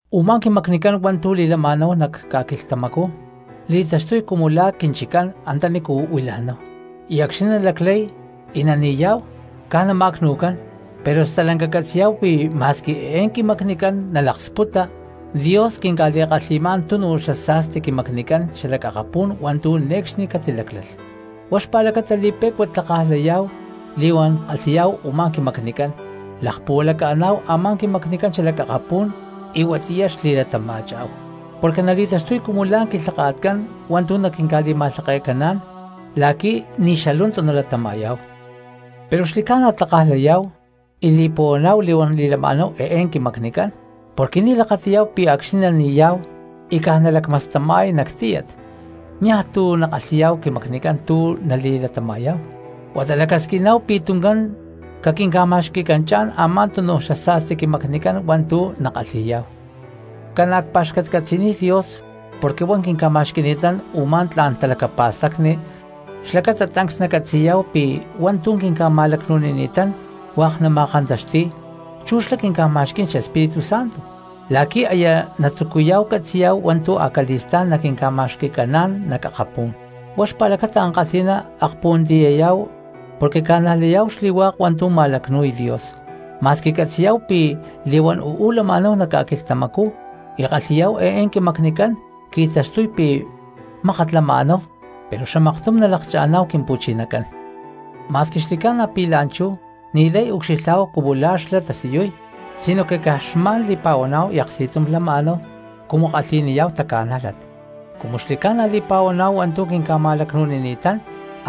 Umá quimacnicán hua̠ntu̠ li̠lama̠náhu nac ca̠quilhtamacú li̠taxtuy cumu la̠ quinchiccán antanícu huila̠náhu, y acxni̠ nalaclay y nani̠yá̠hu caj nama̠cnu̠cán, pero stalanca catzi̠yá̠hu pi̠ ma̠squi eé quimacnicán nalaksputa Dios quinca̠li̠kalhi̠má̠n tunu xasa̠sti quimacnicán xalac akapú̠n hua̠ntu̠ ne̠cxni catiláclalh. Huá xpa̠lacata li̠pe̠cua tlakaj layá̠hu li̠huán kalhi̠yá̠hu u̠má quimacnicán lakpuhualaca̠ná̠hu a̠má quimacnicán xalac akapú̠n y huatiyá xli̠latama̠chá̠hu. Porque nali̠taxtuy cumu la̠ quilhaka̠tcán hua̠ntu̠ naquinca̠li̠ma̠lhake̠caná̠n la̠qui̠ ni̠ xalu̠ntu nalatama̠yá̠hu. Pero xli̠ca̠na tlakaj layá̠hu y li̠puhuaná̠hu li̠huán li̠lama̠náhu eé quimacnicán porque ni̠ lakati̠yá̠hu pi̠ acxni̠ nani̠yá̠hu y caj nalacmastama̠y nac tíyat niaj tu̠ nakalhi̠yá̠hu quimacnicán tu̠ nali̠latama̠yá̠hu, huata lacasquiná̠hu pi̠ tuncán caquinca̠ma̠xqui̠canchá̠n a̠má túnuj xasa̠sti quimacnicán hua̠ntu̠ nakalhi̠yá̠hu. Ca̠na̠ cpa̠xcatcatzi̠niy Dios porque huá quinca̠ma̠xqui̠ni̠tán u̠má tla̠n xtalacapa̠stacni, xlacata tancs nacatzi̠yá̠hu pi̠ hua̠ntu̠ quinca̠ma̠lacnu̠nini̠tán hua̠k nama̠kantaxti̠y chu̠ xlá quinca̠ma̠xquí̠n xEspíritu Santo, la̠qui̠ aya natzucuyá̠hu catzi̠yá̠hu hua̠ntu̠ acali̠stá̠n naquinca̠ma̠xqui̠caná̠n nac akapú̠n. Huá xpa̠lacata ankalhi̠ná akpuhuantiyayá̠hu porque ca̠najlayá̠hu xli̠hua̠k hua̠ntu̠ ma̠lacnu̠y Dios, ma̠squi catzi̠yá̠hu pi̠ li̠huán uú lama̠náhu nac ca̠quilhtamacú y kalhi̠yá̠hu eé quimacnicán, qui̠taxtuy pi̠ mákat lama̠náhu pero xamaktum nalakcha̠ná̠hu Quimpu̠chinacán. Ma̠squi xli̠ca̠na pi̠ la̠nchú ni̠lay ucxilhá̠hu cumu la̠ xlá tasiyuy, sinoque caj xma̠n li̠pa̠huaná̠hu y aksti̠tum lama̠náhu cumu kalhi̠niyá̠hu taca̠nájlat. Cumu xli̠ca̠na li̠pa̠huaná̠hu hua̠ntu̠ quinca̠ma̠lacnu̠nini̠tán,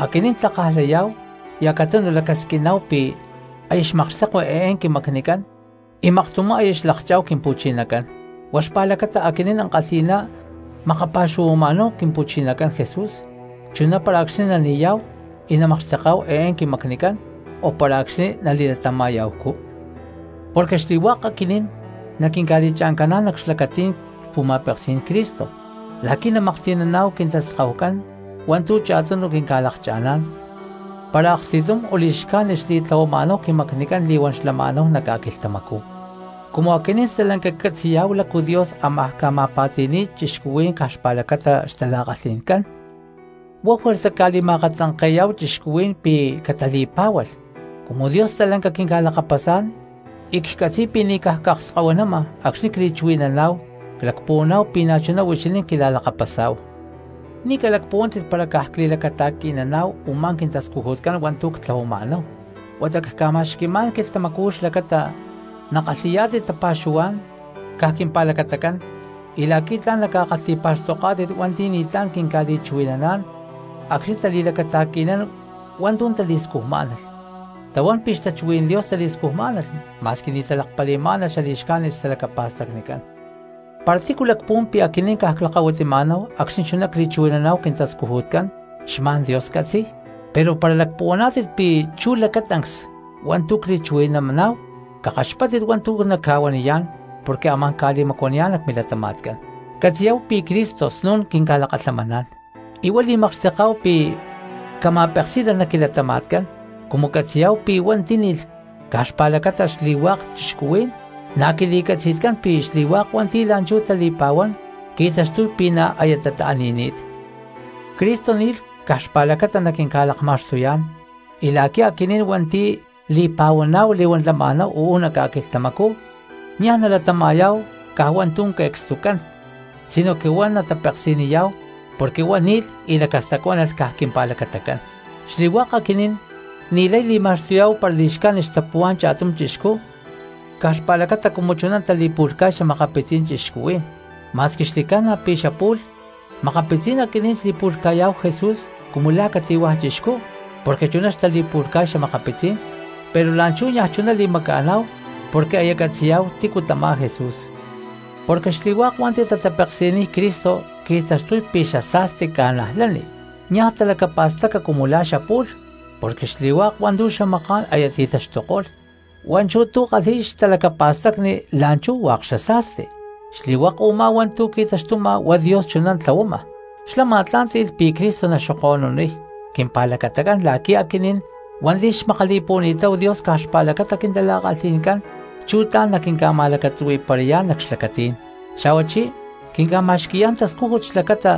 aquinín tlakaj layá̠hu y acatunu lacasquiná̠hu pi̠ aya xmakxtekui eé quimacnicán y maktumá aya xlakchá̠hu Quimpu̠chinacán. Huá xpa̠lacata aquinín ankalhi̠ná makapa̠xuhuama̠náhu Quimpu̠chinacán Jesús, chuná para acxni̠ nani̠yá̠hu y namakxteká̠hu eé quimacnicán o para acxni̠ nali̠latama̠ya̠hucú. Porque xli̠hua̠k aquinín naquinca̠li̠cha̠ncaná̠n nac xlacatí̠n xpu̠ma̠peksí̠n Cristo la̠qui̠ namaklhti̠naná̠hu quintaskahucán hua̠ntu̠ cha̠tunu quinca̠lakcha̠ná̠n, para aksti̠tum o li̠xcájnit xli̠tlahuama̠náhu quimacnicán li̠huán xlama̠náhu nac ca̠quilhtamacú. Cumu aquinín stalanca ccatzi̠yá̠hu lácu Dios ámaj ca̠ma̠pa̠ti̠ni̠y cristianos caj xpa̠lacata xtala̠kalhi̠ncán, huá juerza cca̠li̠ma̠akatzanke̠yá̠hu cristianos pi̠ catali̠pá̠hualh. Cumu Dios stalanca quinca̠lakapasá̠n y catzi̠y pi̠ ni̠ caj cakskahuinama acxni̠ cli̠chuhui̠naná̠hu, clacpuhuaná̠hu pi̠ na̠chuná huixinín quila̠lakapasá̠hu. Ni̠ nalacpuhuaná̠tit para caj cli̠lacata̠qui̠nama̠náhu u̠má quintascujutcán hua̠ntu̠ ctlahuama̠náhu, huata cca̠ma̠xqui̠má̠n quilhtamacú xlacata nakalhi̠yá̠tit tapa̠xuhuá̠n caj quimpa̠lacatacán y la̠qui̠ tla̠n naca̠kalhti̠pa̠xtoká̠tit hua̠nti̠ ni̠tlá̠n quinca̠li̠chuhui̠naná̠n acxni̠ tali̠lacata̠qui̠nán hua̠ntu̠ tali̠scujmá̠nalh, tahuán pi̠ xtachuhuí̠n Dios tali̠scujmá̠nalh ma̠squi ni̠ talakpali̠má̠nalh xali̠xcájnit xtalacapa̠stacnicán. Para tícu lacpuhuán pi̠ aquinín caj clakahuitima̠náhu acxni̠ chuná cli̠chuhui̠nama̠náhu quintascujutcán xma̠n Dios catzi̠y, pero para lacpuhuaná̠tit pi̠ chú lacatancs hua̠ntu̠ cli̠chuhui̠naná̠hu cakaxpáttit hua̠ntu̠ nacca̠huaniyá̠n porque amá̠n ca̠makta̠yayá̠n nac milatama̠tcán. Catzi̠yá̠hu pi̠ Cristo snu̠n quinca̠lakalhamaná̠n y huá li̠makxteká̠hu pi̠ cama̠peksí̠nalh nac quilatama̠tcán. Cumu catzi̠yá̠hu pi̠ huá tíni̠lh caj xpa̠lacatacán xli̠hua̠k cristianos, na̠ quili̠catzi̠tcán pi̠ xli̠hua̠k hua̠nti̠ la̠nchú tali̠pa̠huán qui̠taxtuy pi̠ na̠ aya tata̠ni̠ni̠t. Cristo ni̠lh caj xpa̠lacata naquinca̠lakma̠xtuyá̠n y la̠qui̠ aquinín hua̠nti̠ li̠pa̠huaná̠hu li̠huán lama̠náhu uú nac ca̠quilhtamacú niaj nalatama̠yá̠hu caj hua̠ntu̠ que̠cstucán sinoque huá natapeksi̠niyá̠hu porque huá ni̠lh y lacastacuánalh caj quimpa̠lacatacán. Xli̠hua̠k aquinín ni̠lay nali̠ma̠xtuyá̠hu para li̠xcájnit xtapuhuá̠n cha̠tum chixcú caj xpa̠lacata cumu chuná tali̠pu̠lhca̠y xa̠makapitzí̠n cristianos, ma̠squi xli̠ca̠na pi̠ xapu̠lh makapitzí̠n aquinín xli̠pu̠lhca̠yá̠hu Jesús cumu la̠ cati̠hua̠ chixcú porque chuná xtali̠pu̠lhca̠y xa̠makapitzí̠n, pero la̠nchú niaj chuná li̠maca̠ná̠hu porque aya catzi̠yá̠hu tícu tamá Jesús. Porque xli̠hua̠k hua̠nti̠ tatapeksi̠niy Cristo qui̠taxtuy pi̠ xasa̠sti cristiano, niaj talacapa̠staca cumu la̠ xapu̠lh porque xli̠hua̠k hua̠ntu̠ xamaká̠n aya ti̠taxtuko̠lh, hua̠nchú tu̠ kalhi̠y xtalacapa̠stacni la̠nchú hua̠k xasa̠sti. Xli̠hua̠k u̠má hua̠ntu̠ qui̠taxtuma huá Dios chuná tlahuama, xlá ma̠tlá̠nti̠lh pi̠ Cristo naxoko̠nuniy quimpa̠lacatacán la̠qui̠ aquinín hua̠nti̠ xmakali̠puhuani̠táhu Dios caj xpa̠lacata quintala̠kalhi̠ncán chú tla̠n naquinca̠ma̠lacatzuhui̠parayá̠n nac xlacatí̠n; xa̠huachí quinca̠ma̠xqui̠yá̠n tascújut xlacata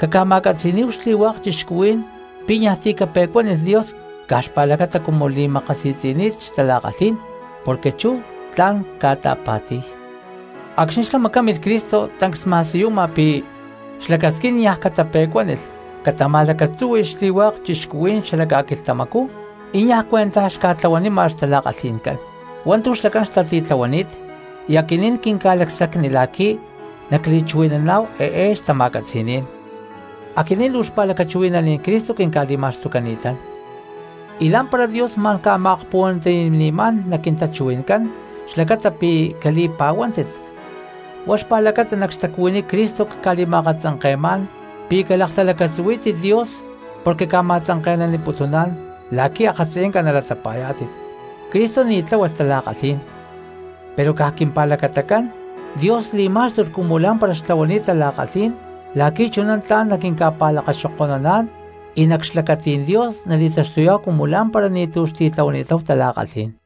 caca̠ma̠catzi̠níhu xli̠hua̠k cristianos pi̠ niaj ti̠ cape̠cuanilh Dios caj xpa̠lacata cumu li̠makasi̠tzi̠ni̠t xtala̠kalhí̠n porque chú tla̠n ta̠pa̠ti̠ni̠y. Acxni̠ xlá macámilh Cristo tancs xma̠siyuma pi̠ xlacasquín niaj catape̠cuánilh catama̠lacatzúhui̠lh xli̠hua̠k cristianos xala ca̠quilhtamacú, y niaj cuentaj xca̠tlahuanima xtala̠kalhi̠ncán hua̠ntu̠ xlacán xtatitlahuaniy; y aquinín quinca̠lacsacni la̠qui̠ nacli̠akchuhui̠naná̠hu eé xtama̠catzi̠ní̠n. Aquinín luu xpa̠lacachuhui̠naní̠n Cristo quinca̠li̠ma̠xtucani̠tán, y lá̠mpara Dios ma̠n ca̠ma̠akpuhuantiyani̠má̠n nac quintachuhui̠ncán xlacata pi̠ cali̠pa̠huántit. Huá xpa̠lacata nac xtacuhuiní Cristo cca̠li̠ma̠akatzanke̠má̠n pi̠ calaktalacatzuhuí̠tit Dios porque ca̠ma̠tzanke̠naniputuná̠n la̠qui̠ akatziyanca nata̠latapa̠yá̠tit. Cristo ni̠ tláhualh tala̠kalhí̠n, pero caj quimpa̠lacatacán Dios li̠má̠xtulh cumu lá̠mpara xtlahuani̠t tala̠kalhí̠n la̠qui̠ chuná tla̠n naquinca̠pa̠lakaxoko̠nuná̠n y nac xlacatí̠n Dios nali̠taxtuyá̠hu cumu lá̠mpara ni̠tu̠ xtitlahuani̠táhu tala̠kalhí̠n.